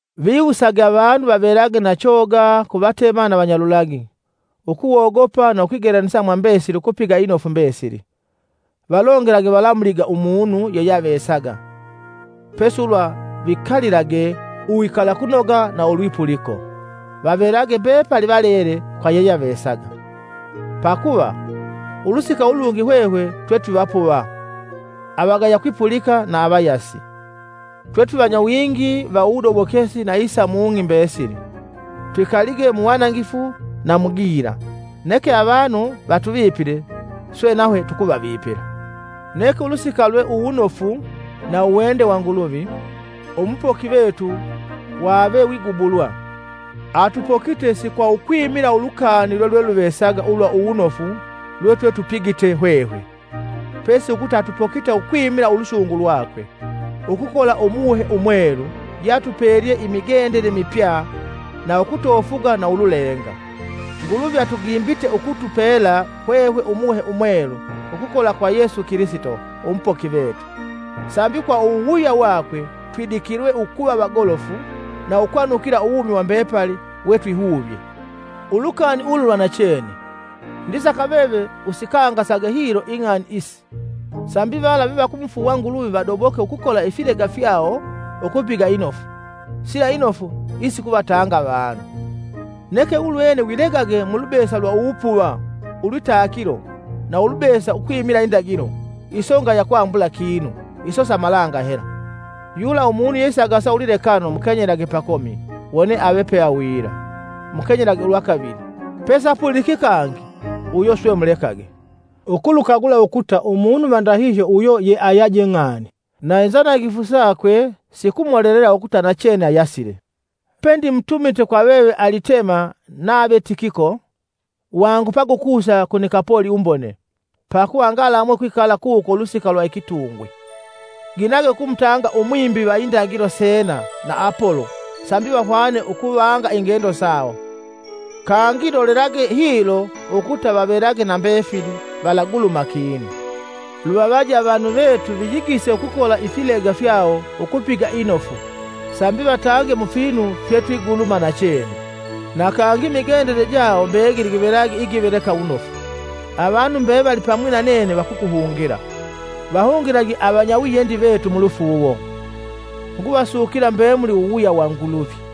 Viwusage avanu vavelage na choga ku vatema na vanyalulagi, ukuwogopa na ukwigelanisa mwa mbesili ukupiga inofu mbesili. Valongelage valamuliga umunu yeyeavesaga; pesi ulwa vikalilage uwikalakunoga na ulwipuliko, vavelage mbepali valele kwa yeyeavesaga. Pakuva, ulusika ulungi hwehwe twetwivapuva, avagaya kwipulika na avayasi. Twe twivanyawingi wa uwudobokesi na isa mung'i wewevuvesaga. Twikalige muwanangifu na mu gila; neke avanu vatuvipile swe nahwe tukuvavipila. Neke ulusika lwe uwunofu na uwende wa Nguluvi, Umupoki vetu wavewigubulwa. Atupokite si kwa ukwimila ulukani lwelweluvesaga ulwa uwunofu lwetwetupigite hwehwe, pesi ukuta atupokite ukwimila ulusungu lwakwe, ukukola Umuhe Umwelu yeatupelye imigendele mipya na ukutofuga na ululenga. Nguluvi atugimbite ukutupela hwehwe Umuhe Umwelu ukukola kwa Yesu Kilisito, Umupoki vetu, Sambi kwa uwuwuya wakwe twidikilwe ukuva vagolofu na ukwanukila uwumi wa mbepali wetwihuvye. Ulukani ulu lwa nachene. Ndisaka veve usikangasage hilo ing'ani isi, sambi vala vevakumufuuwa Nguluvi vadoboke ukukola ifilega fyawo ukupiga inofu, sila inofu isikuvatanga avanu. Neke ulwene wilegage mulubesa lwa uwupuva, ulwitakilo na ulubesa ukwimila indagilo. Iso ngaya kwambala kinu, iso sa malanga hela. Yula umunu yeisagasa ulwilekano mukenyelage pakomi wone ave peawila, mukenyelage ulwa kavili, pesapuliki kangi uyo swe mulekage, ukulukagula ukuta umunu va ndahihyo uyo yeayaje ng'ani, na inzanangifu sakwe sikumolelela ukuta nachene ayasile. Pendimutumite kwa veve Alitema nave Tikiko, wangupage ukusa ku Nikapoli umbone, pakuva ngalamwe ukwikala kuko ulusika lwa ikitungwi. Ginage ukumutanga umwimbi va indagilo Sena na Apolo sambi vahwane ukuvanga ingendo sawo, kangi lolelage hilo ukuta vavelage na mbefili, valaguluma kinu. Luvavaje avanu vetu viyigise ukukola ifilega fyawo ukupiga inofu sambi vatange mufinu fyetwiguluma nachene, na kangi imigendele jawo mbegili givelage ja kwambula inofu. Avanu mbevali pamwi na nene vakukuhungila. Vahungilage vanyawiyendi vetu mulufuuwo. Nguvasukila mbemuli uwuwuya wa Nguluvi.